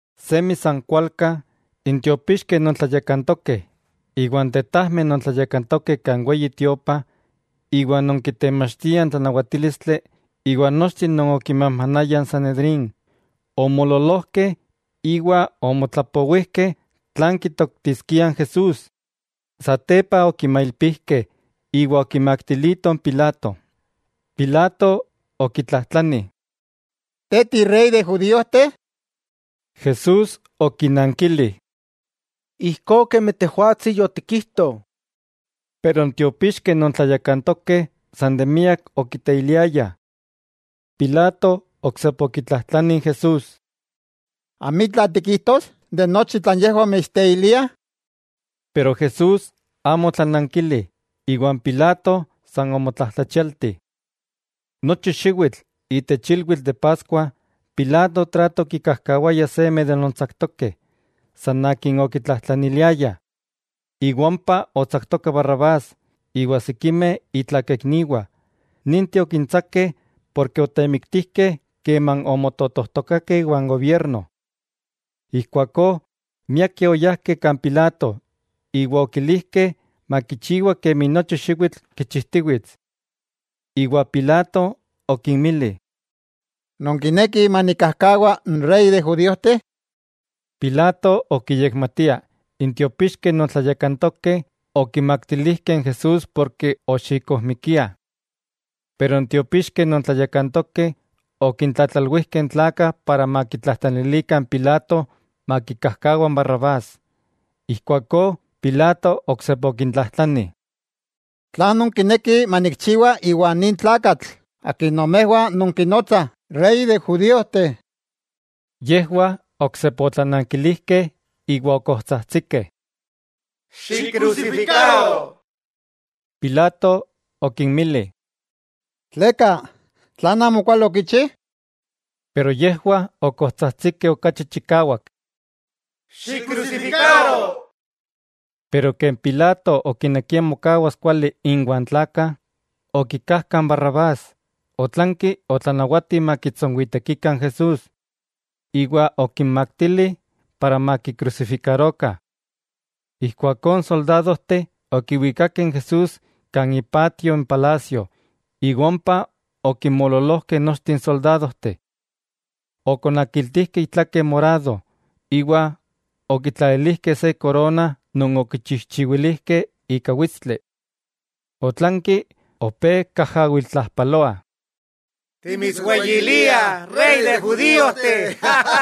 Semi san kualka, n tiopixkeh non tlayakantokeh, iwa n tetajmeh non tlayakantokeh kan Weyi Tiopa iwa non kitemachtiah n tlanawatílistli iwa nochteh non okimajmanayah n Sanedrín, omoololojkeh iwa omotlapowijkeh tlan kitoktiskiah n Jesús. Satepa okimailpijkeh iwa okimaktilitoh n Pilato. Pilato okitlajtlani: —¿Te tirey de judíojteh? Jesús okinankili: —Ijkó kemi tejwatsi yotikijto. Pero n tiopixkeh non tlayakantokeh san de miak okiteiliayah. Pilato oksepa okitlajtlani Jesús: —¿Amitla tikijtos de nochi tlan yejwah mitsteiliah? Pero Jesús amo otlanankili iwa n Pilato san omotlajtlachialti. Nochi xiwitl itech ilwitl de Paskua, Pilato trato okikajkawaya seme de non tsaktokeh, san akin okitlajtlaniliayah. Iwa ompa otsaktoka Barrabás iwa sikimeh itlakaikniwah, ninteh okintsakeh ken otemiktijkeh keman omototojtokakeh iwan gobierno. Ijkuakó, miakeh oyajkeh kan Pilato iwa okilijkeh makichiwa kemi nochi xiwitl kichijtiwits. Iwa Pilato okinmili: —¿Nonkinekih manikkajkawa n Rey de judíojteh? Pilato okiyekmatia n tiopixkeh non tlayakantokeh okimaktilijkeh n Jesús porke oxikojmikiah. Pero n tiopixkeh non tlayakantokeh okintlatlalwijkeh n tlakah para makitlajtlanilikah n Pilato makikajkawa Barrabás. Ijkuakó Pilato oksepa okintlajtlani: —¿Tlan nonkinekih manikchiwa iwa nin tlakatl akin nomejwah nonkinotsah Rey de n judíojteh? Yejwah oksepa otlanankilijkeh iwa okojtsajtsikeh: —¡Xikkrusifikaro! Pilato okinmili: —¿Tleka? ¿Tlan amokuali okichi? Pero yejwah okojtsajtsikeh okachi chikawak: —¡Xikkrusifikaro! Pero ken Pilato okinekia mokawas kuali inwa n tlakah, okikajka n Barrabás, otlanki otlanawati makitsonwitekikah n Jesús, iwa okinmaktili para makikrusifikarokah. Ijkuakó n soldadojteh okiwikakeh n Jesús kan ipatio n palasio iwa ompa okinmoololojkeh nochteh n soldadojteh. Okonakiltijkeh itlake morado, iwa okitlalilijkeh se korona non okichijchiwilijkeh ika witstli. Otlanki opé kajawiltlajpaloah: —¡Timitsweyiliah Rey de judíojteh!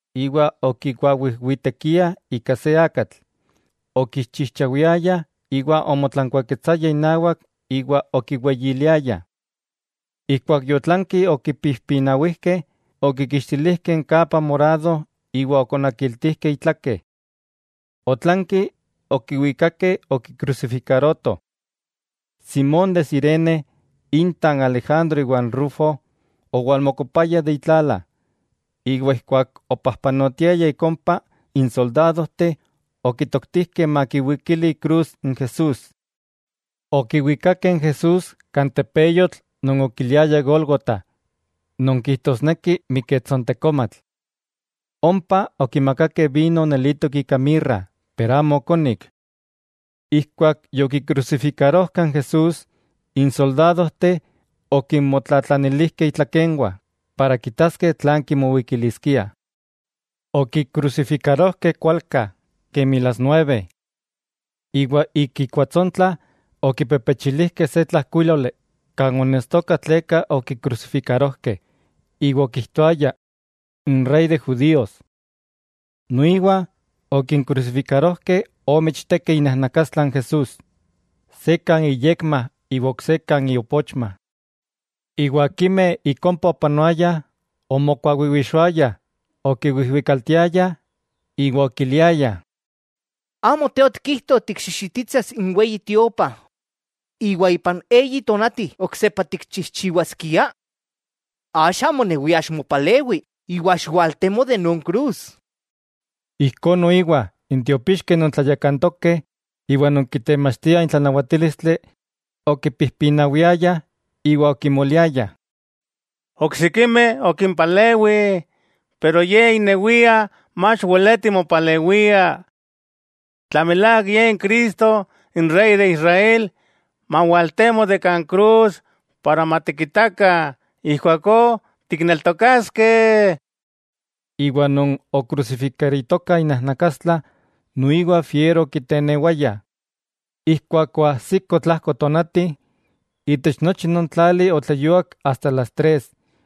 Iwa okikuawijwitekiah ika se akatl, okiixchijchawiayah iwa omotlankuaketsayah inawak iwa okiweyiliayah. Ijkuak yotlanki okipijpinawijkeh, okikixtilijkeh n kapa morado iwa okonakiltijkeh itlake. Otlanki okiwikakeh okikrusifikarotoh. Simón de Cirene inta n Alejandro iwa n Rufo, owalmokopaya de itlala, iwa ijkuak opajpanotiaya ik ompa n soldadojteh okitoktijkeh makiwikili ikrus n Jesús. Okiwikakeh n Jesús kan tepeyotl non okiliayah Gólgota non kijtosneki Miketsontekomatl. Ompa okimakakeh vino nelitok ika mirra pero amo okonik. Ijkuak yokikrusifikarojkah n Jesús, n soldadojteh okinmotlatlanilijkeh itlakenwah para kitaskeh tlan kimowikiliskiah. Okikrusifikarojkeh kualka, kemi las nueve. Iwa ik ikuatsontla okipepechilijkeh se tlajkuíloli kan onestoka tleka okikrusifikarojkeh, iwa okijtoaya: “N Rey de Judíos.” Noiwa okinkrusifikarojkeh ome ichtekeh inajnakastla n Jesús, se kan iyekma iwa ok se kan iopochma. Iwa akimeh ik ompa opanoayah omokuawiwixoayah, okiwijwikaltiayah iwa okiliayah: —¿Amo Te otikijto tikxixititsas n Weyi Tiopa iwa ipan eyi tonati oksepa tikchijchiwaskia?, axa monewia ximopalewi iwa xiwaltemo de non krus. Ijkó noiwa n tiopixkeh non tlayakantokeh iwa non kitemachtiah n tlanawatílistli, okipijpinawiayah iwa okimoliayah: —Oksikimeh okimpalewi, pero ye inewia, mach weleti mopalewia. Tla milák Ye n Cristo, n Rey de Israel, mawaltemo de kan krus para matikitakah ijkuakó tikneltokaskeh. Iwa non okrusifikaritokah inajnakastla noiwa fiero okitenewaya. Ijkuak oajsiko tlajko tonati, itech nochi non tlali otleyuak asta las tres.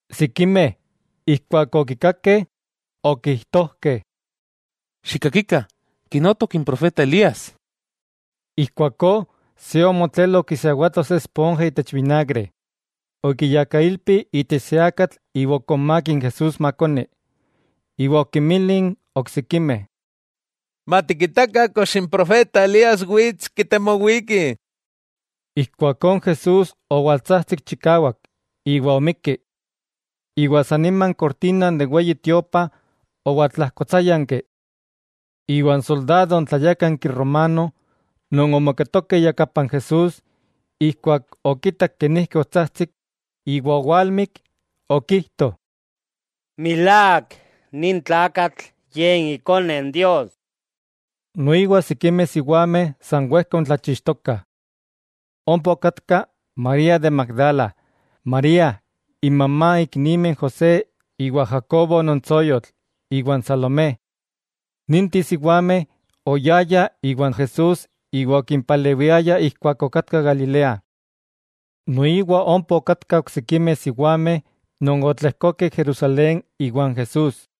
Sikimeh ijkuak okikakeh, okijtojkeh: —¡Xikkakikah!, kinotok n profeta Elías. Ijkuakó se omotlelo okisiawato se esponja itech vinagre. Okiyakailpi itech se akatl iwa okonmák n Jesús makoni, iwa okinmili n oksikimeh: —Matikitakah kox n profeta Elías wits kitemowiki. Ijkuakó n Jesús owaltsajtsik chikawak, iwa omikki. San nima n kortina de n Weyi Tiopa owaltlajkotsáyanki. Iwa n soldado tlayákanki romano non omoketoka iyakapan Jesús, ijkuak okitak kenijki otsajtsik iwa owalmik, okijto: —¡Milák, nin tlakatl ye Ikone Dios! Noiwa sikimeh siwameh san wejka oontlachixtokah. Ompa okatkah María de Magdala, María inmamá n iknimeh José iwa n Jacobo non tsoyotl, iwa n Salomé. Ninteh siwameh oyayah iwan Jesús iwa okimpalewiayah ijkuak okatka Galilea. Noiwa ompa okatkah oksikimeh siwameh non otlejkokeh Jerusalén iwan Jesús.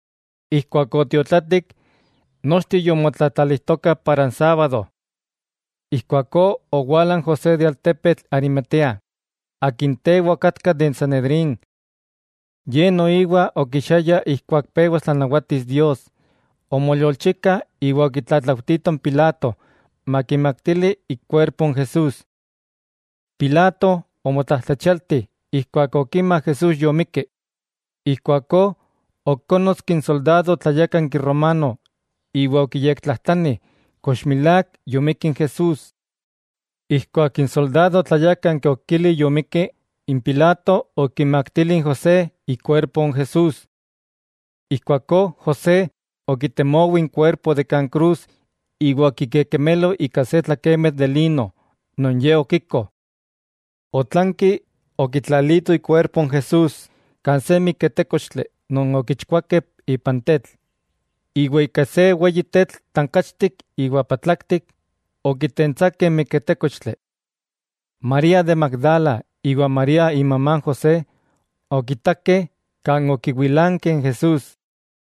Ijkuak otiotlatik, nochteh yomotlatlalijtokah para n sábado. Ijkuakó owala n José de n altepetl Arimatea, akin tewa okatka de n Sanedrín. Ye noiwa okichiaya ijkuak pewas tlanawatis Dios, omoyolchika iwa okitlatlaujtito n Pilato makimaktili ikuerpo n Jesús. Pilato omotlajtlachialti ijkuak okima Jesús yomikki, ijkuakó okónnotski n soldado tlayákanki romano iwa okiyektlajtlani kox milák yomikki n Jesús. Ijkuak n soldado tlayákanki okili yomikki, n Pilato okimaktili n José ikuerpo n Jesús. Ijkuakó José okitemowi n kuerpo de kan krus iwa okikekemelo ika se tlakemitl de lino, non ye okiko. Otlanki okitlalito ikuerpo n Jesús kan se miketékochtli non okichkuakeh ipan tetl, iwa ika se weyi tetl tankachtik iwa patlaktik okitentsakeh n miketékochtli. María de Magdala iwa María imamá n José okitakeh kan okiwilankeh n Jesús.